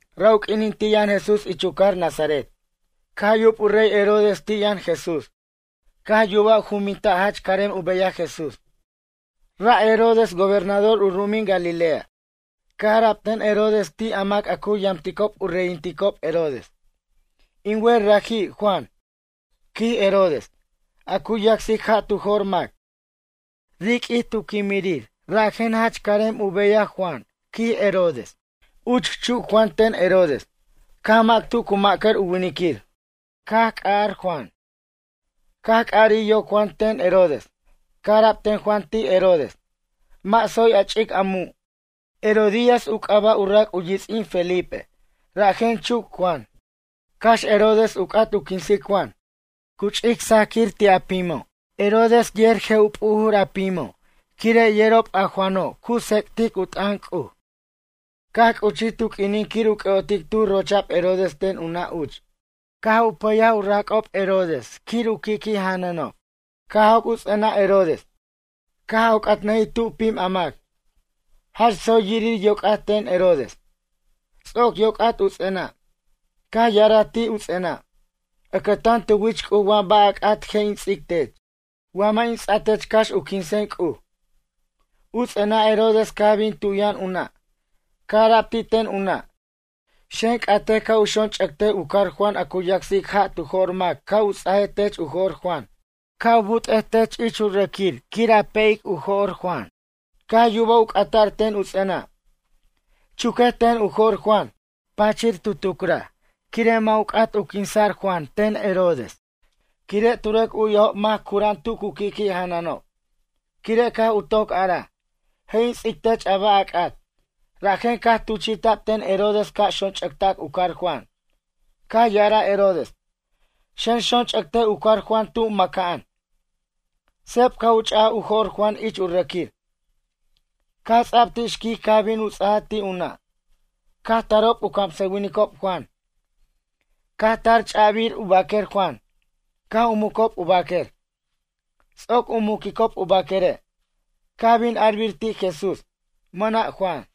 Ra' u q'uinin ti' yʌn Jesús ich u cajar Nazaret. Caj yub u rey Herodes ti' yʌn Jesús. Caj yubaj u jumbinta' jach carem u beyaj Jesús. Ra' Herodes gobernador u ru'umin Galilea. Caj ara'b ten Herodes ti' a mac a cu yamticob u reyinticob Herodes: ―In wer raji' Juan ―quij Herodes―, a cu yacsic ja' tu jo'r mac. Riq'uij caj quimij rajen jach carem u beyaj Juan ―quij Herodes. Uch chuc Juan ten Herodes. Caj mac tu cu ma'cʌr u winiquir. Caj c'arar Juan. Caj c'arij yoc Juan ten Herodes. Caj ara'b ten Juan ti' Herodes: ―Mʌ' tsoy a ch'ic a mu'. Herodías u c'aba' u rac' u yits'in Felipe. Rajen chuc Juan. Cax Herodes u c'at u quinsic Juan, cu ch'ic sajquir ti' a pimo'. Herodes yer je' u p'ujur a pimo', quire' yerob a Juano' cu tsec'tic u t'ʌn C'uj. Caj c'uchij tu q'uinin quir u c'ʌ'otic tuj rocha'b Herodes ten u nʌ' uch. Caj u pʌyaj u rac'ob Herodes quir u qui'qui' janʌnob. Caj joc' u ts'enʌ' Herodes. Caj oc'atnʌjij tu pim a mac. Jach tsoy yirir yoc'at ten Herodes. Ts'oc yoc'at u ts'enʌ', caj ya'araj ti' u ts'enʌ': ―Ʌcʌtan tu wich C'uj wa ba' a c'at je' in ts'ic tech. Wa mʌ' in ts'a tech cax u quinsen C'uj. U ts'enʌ' Herodes caj bin tu yʌn u nʌ'. Caj ara'b ti' ten u nʌ': ―Xen c'atej ca' u xonch'ʌctej u car Juan a cu yacsic ja' tu jo'r mac ca' u ts'aj tech u jo'r Juan. Ca' u but'ej tech ich u rʌquir quir a pe'jic u jo'r Juan. Caj yubaj u c'ata'r ten u ts'enʌ': ―Chuquej ten u jo'r Juan. Tu pachir tucraj quire' mʌ' u c'at u quinsa'r Juan ten Herodes. Quire' tu rʌc u'yajob mac cura'an tu cu qui'qui' janʌnob, quire' caj u toc araj: “Je' in ts'ic tech a ba' a c'at.” Rajen caj tuchi'ta'b ten Herodes ca' xonch'ʌctac u car Juan. Caj ya'araj Herodes: ―Xen xonch'ʌctej u car Juan tu mʌca'an. Seb caj u ch'aj u jo'r Juan ich u rʌquir. Caj ts'a'b ti' xquic caj bin u ts'aj ti' u nʌ'. Caj tarob u camsʌwinicob Juan. Caj tar ch'a'bir u baquer Juan, caj u mucob u baquer. Ts'oc u muquicob u baquere', caj bin arbir ti' Jesús: “Mʌna' Juan.”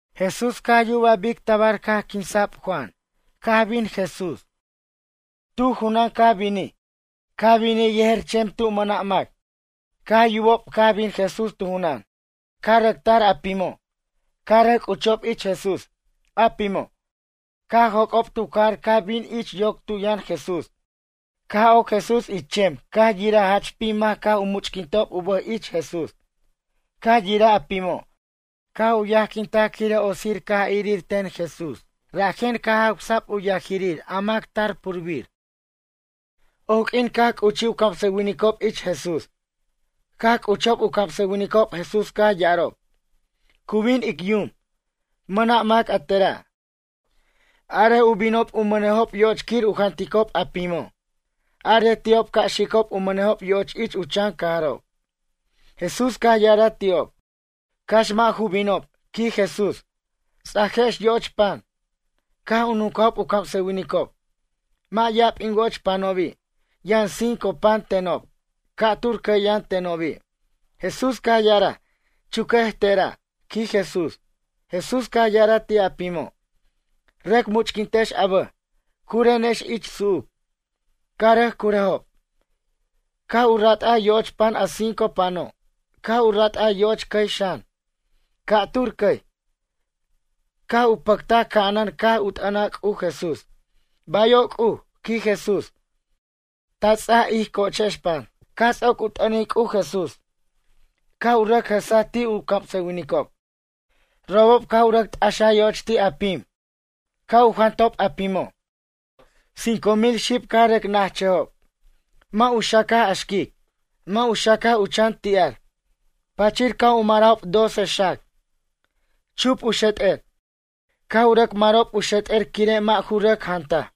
Jesús caj yubaj bic tabar caj quinsa'b Juan caj bin Jesús. Tu junan caj binij. Caj binij yejer chem tu mʌna' mac. Caj yubob caj bin Jesús tu junan, caj rʌc tar a pimo'. Caj rʌc c'uchob ich Jesús. A pimo', caj joc'ob tu cajar caj binob ich yoc tu yʌn Jesús. Caj oc Jesús ich chem caj yiraj jach pim mac caj u much'quintob u bʌj ich Jesús. Caj yiraj a pimo', caj u yajquintaj quire' otsir caj irir ten Jesús rajen. Caj jawsa'b u yajirir a mac tar purbir. Oq'uin caj c'uchij u camsʌwinicob ich Jesús. Caj c'uchob u camsʌwinicob Jesús caj ya'arob: ―Cu bin ic yum. Mʌna' mac a tera'. Arej u binob u mʌnejob yo'och quir u janticob a pimo'. Arej ti'ob ca' xicob u mʌnejob yo'och ich u chan cajarob. Jesús caj ya'araj ti'ob: ―Cax mʌ' ju binob ―quij Jesús―. Ts'ajex yo'och pan. Caj u nuncajob u camsʌwinicob: ―Mʌ' ya'ab in wo'och panobi'. Yʌn cinco pan tenob. Ca'tur cʌy yʌn tenobi'. Jesús caj ya'araj: ―Chuquej tera' ―quij Jesús. Jesús caj ya'araj ti' a pimo': ―Rʌc much'quintex a bʌj. Curenex ich su'uc. Caj rʌc curʌjob. Caj u rat'aj yo'och pan a cinco pano'. Caj u rat'aj yo'och cʌy xan, ca'tur cʌy. Caj u pʌctaj ca'anan caj u t'ʌnaj C'uj Jesús: ―Bayo' C'uj ―quij Jesús―. Ta ts'aj ij co'ochex pan. Caj ts'oc u t'ʌnic C'uj Jesús, caj u rʌc jʌsaj ti' u camsʌwinicob. Robob ca' u rʌc t'axaj yo'och ti' a pim. Caj u jantob a pimo', cinco mil xib caj rʌc na'achʌjob. Mʌ' u xacaj a xquic, mʌ' u xacaj u chan ti'ar. Pachir caj u marajob doce xac, chup u xet'er. Caj u rʌc marob u xet'er quire' mʌ' ju rʌc jantaj.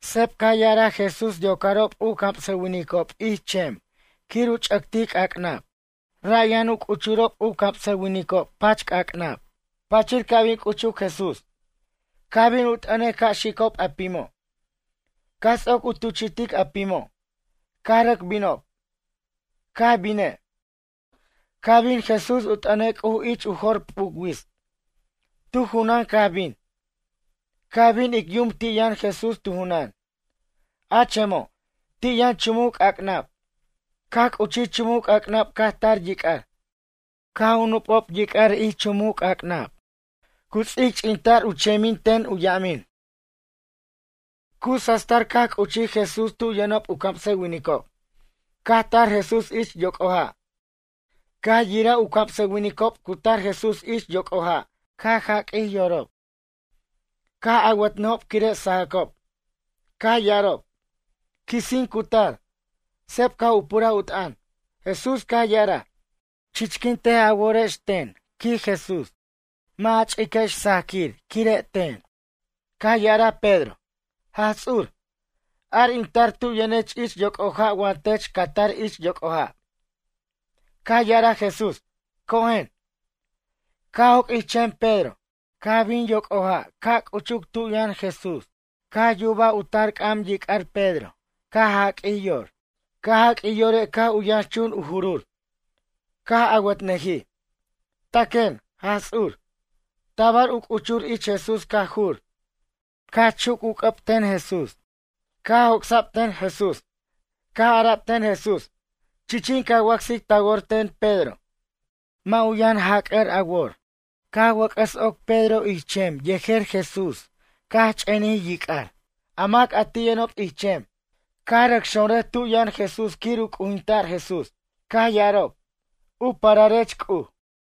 Seb caj ya'araj Jesús yocarob u camsʌwinicob ich chem quir u ch'ʌctic c'ac'nab. Ra' yʌn u c'uchurob camsʌwinicob pach c'ac'nab. Pachir ca' bin c'uchuc Jesús. Caj bin u t'ʌnej ca' xicob a pimo'. Caj ts'oc u tuchi'tic a pimo', caj rʌc binob. Caj bine', caj bin Jesús u t'ʌnej C'uj ich u jo'r p'uc wits. Tu junan caj bin. Caj bin ic yum ti' yʌn Jesús tu junan. A chemo', ti' yʌn chumuc c'ac'nab. Caj c'uchij chumuc c'ac'nab caj tar yic'ar. Caj nup'o' yic'ar ich chumuc c'ac'nab. Cu ts'icch'inta'r u chemin ten u yamin. Cu sastar caj c'uchij Jesús tu yʌnob u camsʌwinicob. Caj tar Jesús ich yoc'o ja'. Caj yiraj u camsʌwinicob cu tar Jesús ich yoc'o ja' caj jaq'uij yorob. Caj awʌtnʌjob quire' sajʌcob. Caj ya'arob: ―Quisin cu tar. Seb caj u puraj u t'ʌn, Jesús caj ya'araj: ―Chichquintej a worex, ten ―quij Jesús―. Mʌ' ja ch'iquex sajquire' ten. Caj ya'araj Pedro: ―Jaj Ts'ur, ar in tar tu yʌnech ich yoc'o ja' wa tech ca tar ich yoc'o ja'. Caj ya'araj Jesús: ―Cojen. Caj joc' ich chem Pedro. Caj bin yoc'o ja' caj c'uchuc tu yʌn Jesús. Caj yubaj u tar c'am yic'ar Pedro caj jaq'uij yor. Caj jaq'uij yore' caj u yʌnxchun u jurur. Caj awʌtnʌjij: ―Taquen, Jaj Ts'ur. Tabar u c'uchur ich Jesús caj jur. Caj chuc u c'ʌb ten Jesús, caj joc'sa'b ten Jesús. Caj ara'b ten Jesús: ―Chichin ca wacsic ta wor ten Pedro. Mʌ' ju yʌn jac'ʌr a wor. Caj wʌc'ʌs oc Pedro ich chem yejer Jesús caj ch'enij yic'ar. A mac a ti' yʌnob ich chem, caj rʌc xonrʌj tu yʌn Jesús quir u c'ujinta'r Jesús. Caj ya'arob: ―U pararech C'uj.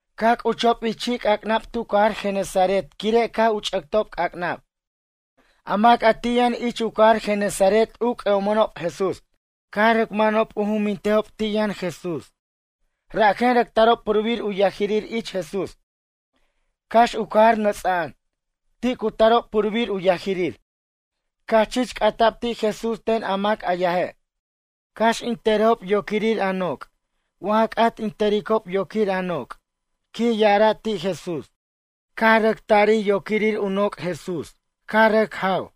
Caj c'uchob ich chi'c'ac'nab tu cajar Genesaret quire' caj u ch'ʌctob c'ac'nab. A mac a ti' yʌn ich u cajar Genesaret u c'ʌ'omʌnob Jesús. Caj rʌc manob u jumbintejob ti' yʌn Jesús. Rajen rʌc tarob purbir u yajirir ich Jesús. Cax u cajar nʌts'a'an, ti' cu tarob purbir u yajirir. Caj chich c'ata'b ti' Jesús ten a mac a yaje': ―Cax in tʌrejob yoquirir a noc' wa ja c'at in tʌricob yoquir a noc' ―quij ya'araj ti' Jesús. Caj rʌc tarij yoquirir u noc' Jesús caj rʌc jaw.